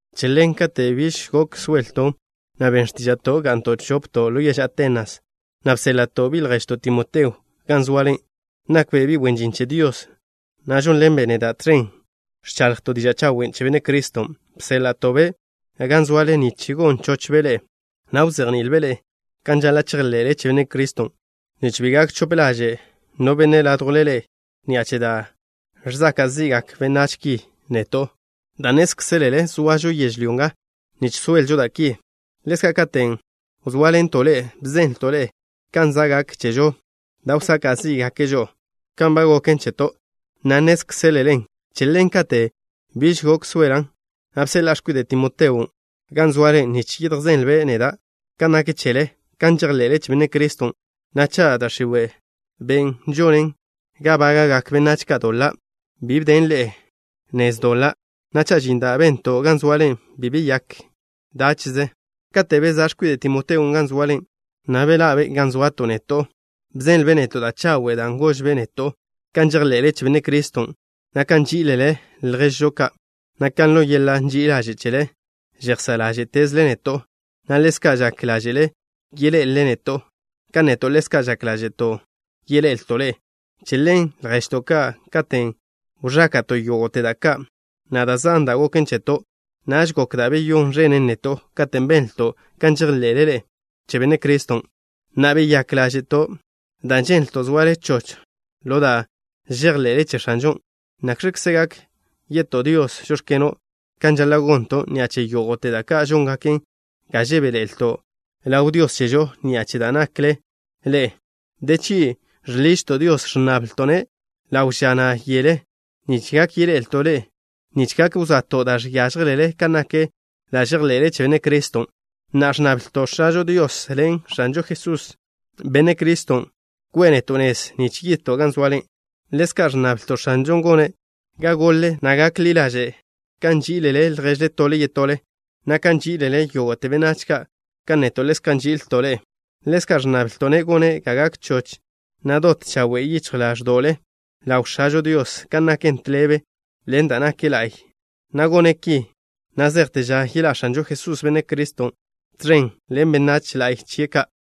Che ḻen, kate' biž gok soelton', na' ben x̱tíža'to' ga'nto' chopto' ḻo yež Atenas, na' bséḻa'to' bi' lježžo, Timoteo, gan zoale. Nakbe' bi' wen žin che Dios, na' žónḻenbe' neda' tẕen ẕchaḻjto' diža' chawen' che Benne' Criston'. Bséḻa'to'-be' gan zoale nich gon chochbe' ḻe'e, na' wzejni'ilbe' ḻe'e kan žaḻa' chejḻe'le che Benne' Criston', nich bi gak chope ḻaže' no benne' ládjwle ḻe'e ni'a che da' žsaka' zi'gak benách ki neto', dan' nnézkzelele zoažo yežlyó nga nich soelžo da' ki. Ḻezka' katen' wzóaḻento' ḻe'e, bzenlto' ḻe'e kan za' gak chežo da' wsaka' zí'gake' žo'o kan ba goken cheto', na' nnézkzelelen. Che ḻen, katen' biž gok soelan', na' bseḻa'a x̱kwide' Timoteon' gan zoale nich yedjzenlbe' neda' kan nak chele, kan žejḻe'le che Benne' Criston', na' cha' da' x̱iwe', ben' žonen ga bága'gak benách ka' doḻa', bi bden ḻe'e nez doḻa', na' cha' žin da' bento' gan zoale bi beyák dáche'ze. Kate' bezá' x̱kwide' Timoteon' gan zoale, na' bežinbe' ga zoato' neto' ni, bzenlbe' neto' da' chawe', dan' gožbe' neto' kan žejḻe'le che Benne' Criston', na' kan nží'ilele lježžo ka', na' kan ḻo yeḻa' ži'i ḻaže' chele žejsá' ḻáže'tezle neto', na' ḻezka' kan žak ḻáže'le yeḻé'elele neto', kan neto' ḻezka' žak ḻáže'to' yeḻe'elto' ḻe'e. Che ḻen, lježto' ka', katen' wẕáka'to' yógo'te da' ka', na' da' zan da' goken cheto', naž gok da' beyón ẕenen neto' katen' benlto' kan žejḻe'le ḻe'e che Benne' Criston'. Na'a, beyák ḻáže'to' dan' ženlto' zoale choch ḻo da' žejḻe'le che X̱anžon'. ¿Nakx̱kze gak ye'to' Dios: “Žóx̱keno'” kan žaḻa' gonto' ni'a che yógo'te da' ka' žóngaken ga žebéḻe'elto' ḻaw Dios chežo ni'a che da' nakle ḻe'e? De chgi' žḻižto' Dios, ẕnnablto'-ne' ḻawe' ža, na' yele, nich gak yeḻe'elto' ḻe'e, nich gak wsa'to' da' žiážjelele kan nak da' žejḻe'le che Benne' Criston'. Na'a ẕnnablto' X̱ažo Dios ḻen X̱anžo Jesús, Benne' Criston', ko'e neto' nez nich yidto' gan zoale. Ḻezka' ẕnnablto' X̱anžon' gone' ga gole, na' gak ḻi ḻaže' kan nží'ilele lježle tole yetole, na' kan nží'ilele yógo'te benách ka', kan neto' ḻezka' nži'ilto' ḻe'e. Ḻezka' ẕnnablto'-ne' gone' ga gak choch, na' dot chawe' yichj ḻáẕdo'le ḻaw X̱ažo Dios kan naken tḻebe ḻen da' nak la'y, na' gone' ki na' zejte ža yeḻá' X̱anžo Jesús, Benne' Criston', tẕen ḻen benách la'y chie' ka'.